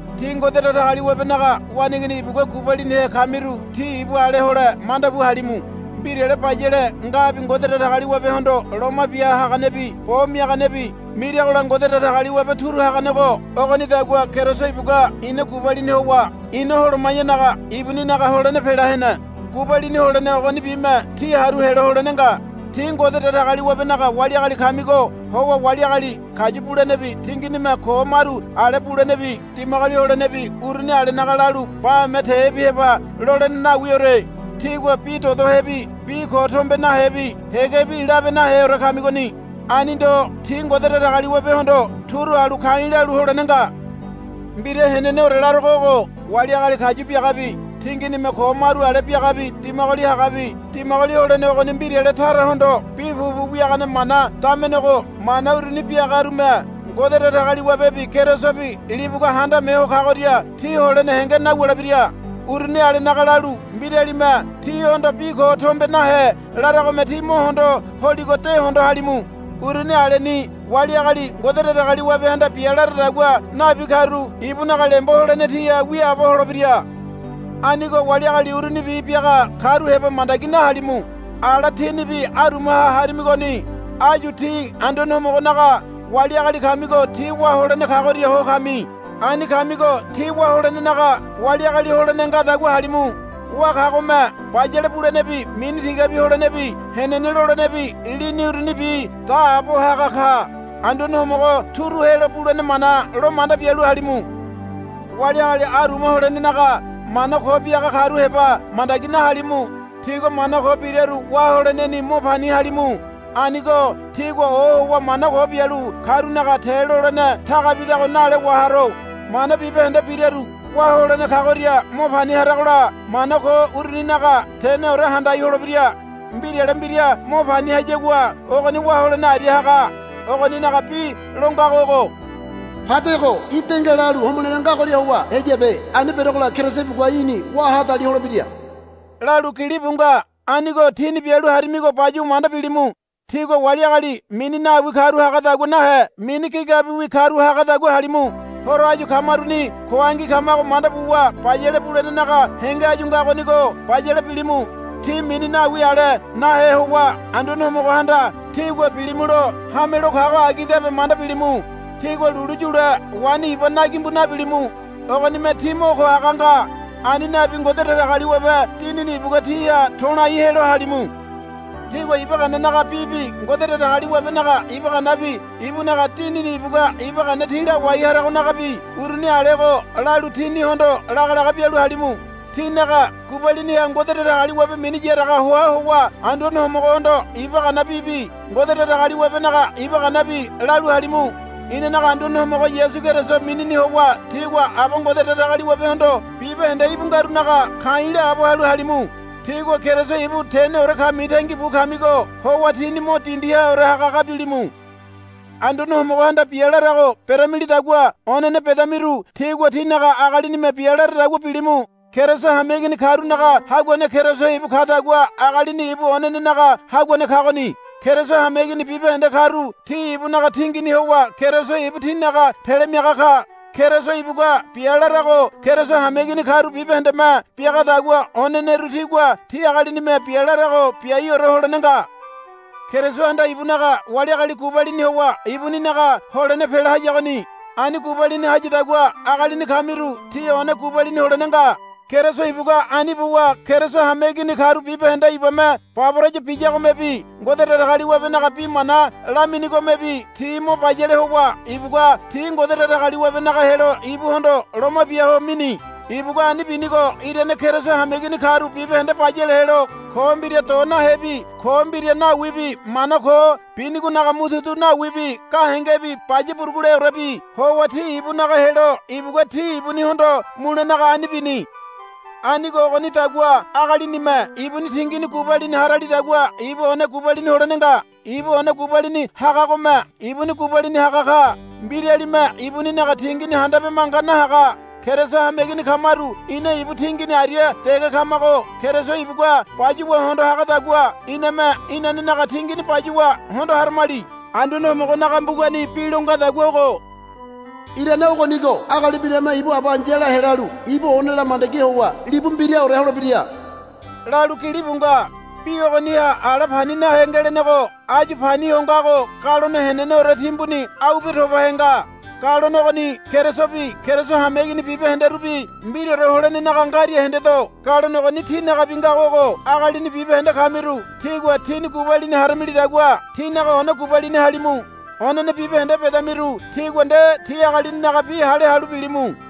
Tí Ngode Datagaliwabenaga waneigini ibugua gubalinihe kamiru tí ibu ale hole manda bu halimu. Mbirale bayale ngabi Ngode Datagaliwabehondo loma bia haganebi bo miaganebi miragola Ngode Datagaliwabe turu haganego ogonidagua Keriso ibugua ina gubalini howa ina holoma̱yanaga ibuninaga holene pela hene. Gubalini holene ogonibime tí haru helo holene nga. Tí Ngode Datagaliwabenaga wali agali kamigo howa wali agali kayu bulenebi tinginime ko maru ale bulenebi dimagoli holenebi uruni alenaga lalu bame tebi heba lolene nawiore. Tígua bi dodohebi bi ko tombe nahebi hegebi labe naheore kamigoni. Ani ndo tí Ngode Datagaliwabehondo turu halu ka̱i̱ lalu holene nga. Mbira heneneore larogo ogo. Wali agali kayu biagabi tinginime ko maru ale biagabi dimagoli hagabi dimagoli holene ogoni mbirale tarahondo bi pupu wiagane mana damenego mana uruni biagarume Ngode Datagaliwabebi Kerisobi libugua Handame Ho Kagoria ti holene henge nawulebira. Uruni alenaga lalu mbiralime tíhondo bi ko tombe nahe laragome tí mo hondo holigo de hondo halimu. Uruni aleni wali agali Ngode Datagaliwabehanda bia laradagua nabi karu ibunaga lembo holene tiha wiaabo holebira. Anigo wali agali urunibi biaga karu heba mandagi nahalimu. Ala tínibi arumaha harimigoni. Áyu tí Anduane Homogonaga wali agali kamigo tí wá holene kagoria ho kami. Ani kamigo tí wá holenenaga wali agali holene ngadagua halimu. Wá kagome bayale bulenebi mini tigabi holenebi henene lolenebi lini urunibi daabo haga ka. Anduane Homogo turu helo bulene mana lo manda bialu halimu. Wali agali aruma holenenaga mana ko biaga karu heba mandagi nahalimu. Tígua mana ko biraru wá holeneni mo pani halimu. Anigo tigua ohowa mana ko bialu karunaga te lolene tagabidago nale waharo. Mana bibahende biraru wá holene kagoria mo pani haragola mana ko uruninaga teneore handai holebira. Mbirale mbira mo pani hayagua ogoni wá holene aria haga. Ogoninaga bi lo ngago ogo, Padego í̠ de ngalalu homolene ngagoria howa heyabe. Ani beregola Keriso ibugua í̠ni wá ha dali holebira, lalu gilibu nga. Anigo tíni bialu haramigo bayuwa manda bilimu. Tígua wali agali mini nawi karu hagadagua nahe mini gigabiwi karu hagadagua halimu. Horo áyu kamaruni koangi kamago manda buwa bayale bulenenaga henge áyu ngagonigo bayale bilimu. Tí mini nawi ale nahe howa Anduane Homogohanda tígua bilimulo hamelo kago agidabe manda bilimu. Tígua lulu yule waini iba nagimbu nabilimu. Ogonime tí mo ko haga nga. Ani nabi Ngode Datagaliwabe Dinini ibugua tíha tolai helo halimu. Tígua Iba Gananaga bibi Ngode Datagaliwabenaga iba ganabi ibunaga Dinini ibugua iba gana tí lawai haragonagabi uruni alego lalu tínihondo lagalaga bialu halimu. Tínaga gubaliniha Ngode Datagaliwabe mini yaraga hoa howa Anduane Homogohondo Iba Gana bibi Ngode Datagaliwabenaga iba ganabi lalu halimu. Inanaga Anduane Homogo Yasu Keriso minini howa tígua Aba Ngode Datagaliwabehondo bibahende íbu ngarunaga ka̱i̱ laabo halu halimu. Tígua Keriso ibu teneore ka mitangi bu kamigo howa tíni mo dindihaore hagahaga bilimu. Anduane Homogohanda bia larago beramilidagua onene bedamiru tígua tínaga agalinime bia laradagua bilimu. Keriso hameigini karunaga haguane Keriso ibu kadagua agalini ibu onenenaga haguane kagoni. Keriso hameigini bibahende karu ti ibunaga tingini howa Keriso ibu tinaga Pele Miaga ka. Keriso ibugua bia larago Keriso hameigini karu bibahendeme biagadagua oneneru tígua tí agalinime bia larago biaiore holene nga. Kerisohanda ibunaga wali agali gubalini howa ibuninaga holene pela hayagoni. Ani gubalini hayadagua agalini kamiru tí one gubalini holene nga. Keriso ibugua ani buwa Keriso hameigini karu bibahende ibame baboraya biyagomebi Ngode Datagaliwabenaga bi mana laminigomebi ti mo bayale howa ibugua ti Ngode Datagaliwabenaga helo ibuhondo loma bia ho mini. Ibugua ani binigo irane Keriso hameigini karu bibahende bayale helo ko mbira do nahebi ko mbira nawibi mana ko binigonaga motudu nawibi gahengebi baya buruguleorebi howa ti ibunaga helo ibugua ti ibunihondo mulenaga ani bini. Anigo ogonidagua agalinime ibuni tingini gubalini haralidagua ibu one gubalini holene nga. Ibu one gubalini hagagome ibuni gubalini haga ka. Mbiralime ibuninaga tingini handabe manga nahaga. Keriso hameigini kamaru ina ibu tingini aria dege kamago Keriso ibugua bayuwa hondo hagadagua iname inanenaga tingini bayuwa hondo haramali. Anduane Homogonaga mbugani bi lo ngadagua ogo, Irane ogonigo agali mbirame ibu aba ai̱yala helalu ibu onela mandagi howa libu mbiraore holebira, lalu gilibu nga. Bi ogoniha ala pani nahe ngelenego áyu pani ho ngago galone heneneore timbuni aube tobahe nga. Galone ogoni Kerisobi Keriso hameigini bibahenderubi mbiraore holenenaga ngaria hendedo. Galone ogoni tínagabi ngago ogo. Agalini bibahende kamiru tígua tíni gubalini haramilidagua tínaga one gubalini halimu. Onene bibahende bedamiru tígua nde tí agalininaga bi hale halu bilimu.